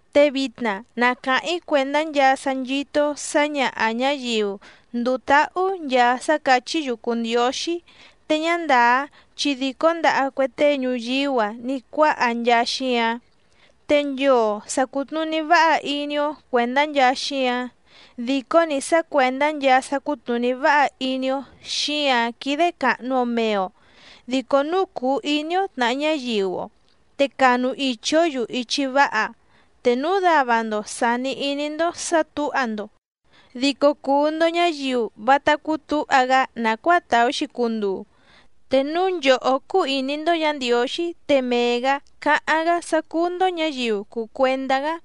Te vitna na càháⁿ‑í cuèndá nchaa sá nchító‑ó sǎñaha ñǎyiu ndùu táhú nchaa sá càchí‑yu cùu ndióxí te ñá ndàá chi dìcó ndaha cue tee ñuyíú‑a ní cuáha nchaa xíǎⁿ. Te nchoo sa cùtnuní váha iní‑ó cuèndá nchaa xíǎⁿ, dìcó‑ni sá cuèndá nchaa sá cútnùní váha iní‑ó xíǎⁿ quídé càhnu‑o mee‑o, dico núu cùu iní‑ó tnàha ñáyiu‑o te canu ichi‑ǒ‑yu ichi váha. Te núu dava‑ndo sàni iní‑ndó sǎ tǔha‑ndo dico cùu‑ndo ñáyiu vátá cútǔha‑gá nàcuáa tàú‑xi cunduu. Te núu nchòhó cúú ìní‑ndó Yǎ Ndiǒxí te mee‑gǎ cáháⁿ‑gá sá cúú‑ndó ñǎyiu cùu cuendá‑gá.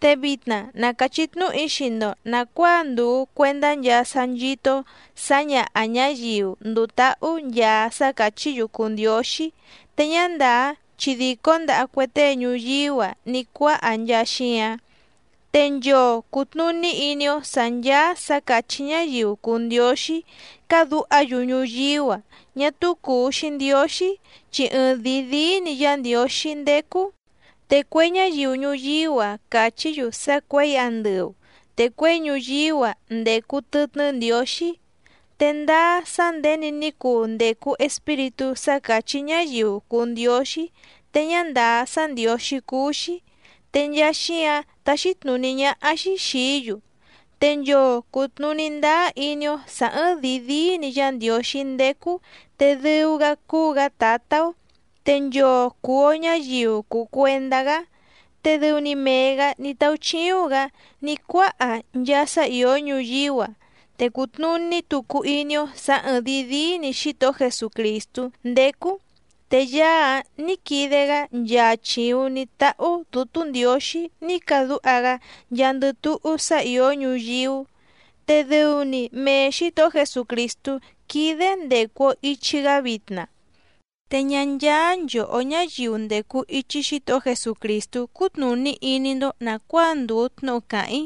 Te vitna na càchí tnúhu‑í xii‑ndo nàcuáa ndùu cuendá nchaa sá nchító‑ó sǎñaha ñǎyiu ndùu táhú nchaa sá càchí‑yu cùu ndióxí te ñá ndàá chi dìcó ndaha cue tée ñuyíú‑a ní cuáha nchaa xíǎⁿ. Te nchoo cùtnuní iní‑ó sǎ ncháá sǎ càchí ñáyiu cùu ndióxí cádǔha‑yu ñuyíú‑a ñá túú cùu‑xi ndióxí, chi ɨɨⁿdìi díí‑ni Yá Ndiǒxí ndécú. Te cue ñáyiu ñuyíú‑a càchí‑yu sá cuěi andɨu te cuěi ñuyíú‑a ndècu tɨtnɨ́ ndiǒxí. Te ndáá sá nděni ní cuu ndècu espíritú sá càchí ñáyiu cùu ndióxí te ñá ndàá sá ndiǒxí cúú‑xí, te nchaa xíǎⁿ táxí tnùní ñáhá‑xí xìí‑yu. Te nchoo cùtnuní ndáá iní‑ó sǎ ɨ̀ɨⁿdii díí‑ni Yá Ndiǒxí ndécú te dɨu‑gá cúú‑gǎ Tǎtá‑ó, te nchoo cùu‑o ñáyiu cùu cuendá‑gá. Te dɨu‑ni mee‑gǎ ní táúchíúⁿ‑gǎ ní cuáha nchaa sá ìó ñuyíú‑a, te cùtnuní tucu iní‑ó sǎ ɨ̀ɨⁿdii díí‑ni Xítohó Jesucrìstú ndécú, te Yaá‑áⁿ nǐ quide‑gá nchaa chìuⁿ ní táhú Dǔtú Ndiǒxí ní cadúha‑gá nchaandɨ túhú sá ìó ñuyíú. Te dɨu‑ni mee Xǐtohó Jesucrìstú quídé ndècu‑o ichi‑gá vitna. Te ñá ncháá nchòhó ñáyiu ndècu ichi Xítohó Jesucrìstú cútnùní iní‑ndó nàcuáa ndùu tnúhu càháⁿ‑í.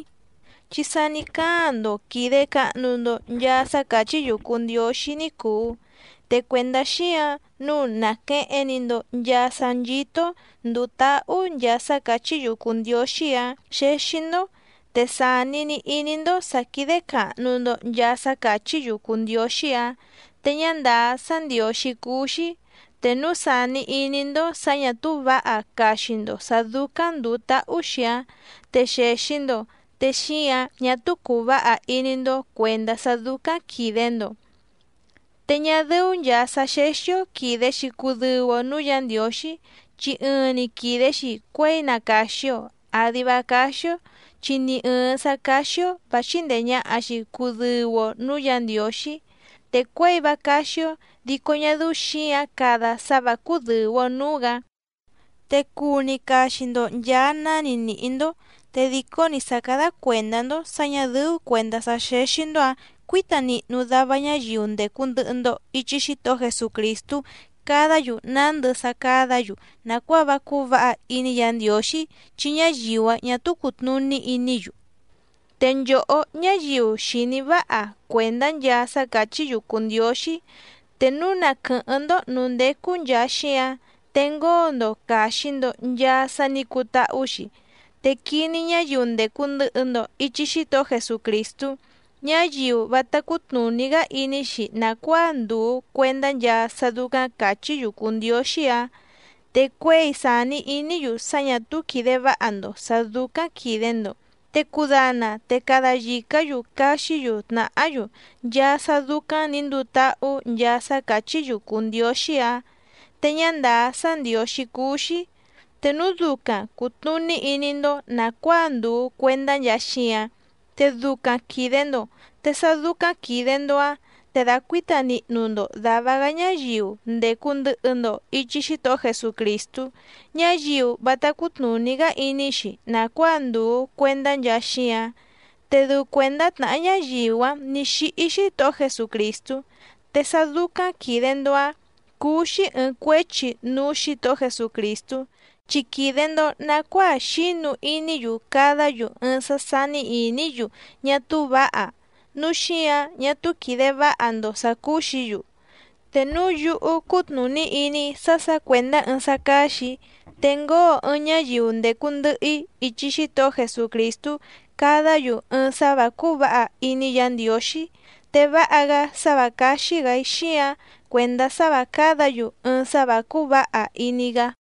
Chi sa ní cáaⁿ‑ndo quìde cahnu‑ndo nchaa sá càchí‑yu cùu ndióxí ní cùu. Te cuèndá xíǎⁿ nǔu nàqueheⁿ‑ni‑ndo nchaa sá nchító‑ó ndùu táhú nchaa sá càchí‑yu cùu ndióxí‑áⁿ xéxí‑ndó, te sàni‑ni iní‑ndó sǎ quídé càhnu‑ndo nchaa sá càchí‑yu cùu ndióxí‑áⁿ te ñá ndàá sá ndiǒxí cúú‑xí. Te núu sàni iní‑ndó sǎ ñà túú vǎha caxi‑ndo sǎ dúcáⁿ ndùu táhú‑xi‑áⁿ te xèxi‑ndo te xíǎⁿ ñá túú cùu váha iní‑ndó cuèndá sá dúcáⁿ quìde‑ndo. Te ñá dɨ́ú nchàa sá xéxí‑ó quìde‑xi cudɨu‑o núú Yǎ Ndiǒxí, chi ɨɨⁿ‑ni quìde‑xi cuéi na càxi‑o àdi vá cáxí‑ó chi ni ɨ̀ɨⁿ sá cáxí‑ó vǎ chíndèe ñaha‑xi cudɨu‑o núú Yǎ Ndiǒxí. Te cuěi vá cáxí‑ó dico ñá dɨ́ú xǐǎⁿ cada sá vǎ cúdɨ̀u‑o núú‑gǎ. Te cuu‑ni caxi‑ndo nchàa náni nìhí‑ndó. Te dìcó‑ni sá càda cuendá‑ndó sǎ ñà dɨ́ú cuèndá sá xéxí‑ndó‑ǎⁿ cuǐta nihnu dava ñáyiu ndècu ndɨhɨ‑ndo ichi Xítohó Jesucrìstú cadá‑yu nándɨ sá cádǎ‑yu nàcuáa vá cúú vǎha iní Yǎ Ndiǒxí chi ñáyiu‑áⁿ ñà túú cùtnuní iní‑yu. Te nchòhó ñáyiu xìní váha cuèndá nchaa sá càchí‑yu cùu ndióxí, te núu na quɨ̀hɨ́ⁿ‑ndó nǔú ndécú nchàa xíáⁿ te ngóo‑ndo càxi‑ndo nchaa sá nǐ cutáhú‑xi, te quiní ñáyiu ndècu ndɨhɨ‑ndo ichi Xítohó Jesucrìstú, ñáyiu vátá cútnùní‑gá iní‑xi nàcuáa ndùu cuendá nchaa sá dúcáⁿ càchí‑yu cùu ndióxí‑áⁿ, te cuěi sàni iní‑yu sá ñà túú quìde váha‑ndo sǎ dúcáⁿ quìde‑ndo te cudana te cada yìcá‑yu caxí‑yu tnàhá‑yu nchaa sá dúcáⁿ nǐ nduu táhú nchaa sá càchí‑yu cùu ndióxí‑áⁿ te ñá ndàá sá ndiǒxí cúú‑xí. Te núu ducaⁿ cùtnuní iní‑ndó nàcuáa ndùu cuendá nchaa xíǎⁿ te ducaⁿ quìde‑ndo, te sá dúcáⁿ quìde‑ndo‑áⁿ te dàcuíta nihnu‑ndo dàva‑gá ñáyiu ndècu ndɨhɨ‑ndo ichi Xítohó Jesucrìstú, ñáyiu vátá cútnùní‑gá iní‑xi nàcuáa ndùu cuendá nchaa xíǎⁿ, te dɨu cuèndá tnàhá ñáyiu‑áⁿ nǐ xíhí Xítohó Jesucrìstú. Te sá dúcáⁿ quìde‑ndo‑áⁿ cúú‑xí ɨ̀ɨⁿ cuéchi núú Xǐtohó Jesucrìstú, chi quìde‑ndo nacuáa xínu iní‑yu cadá‑yu ɨɨⁿ sá sání ìní‑yu ñá túú vǎha, núu xíǎⁿ ñá túú quìde váha‑ndo sǎ cúú‑xǐ‑yu. Te núu yúhú cútnùní iní‑í sá sǎ cuèndá ɨɨⁿ sá cáxì‑í te ngóo ɨɨⁿ ñáyiu ndècu ndɨhɨ‑í ichi Xítohó Jesucrìstú cadá‑yu ɨɨⁿ sá vǎ cúú vǎha iní Yǎ Ndiǒxí, te váha‑gá sá vǎ cáxí‑gǎ‑í xíǎⁿ cuèndá sá vǎ cádǎ‑yu ɨɨⁿ sá vǎ cúú vǎha iní‑gá.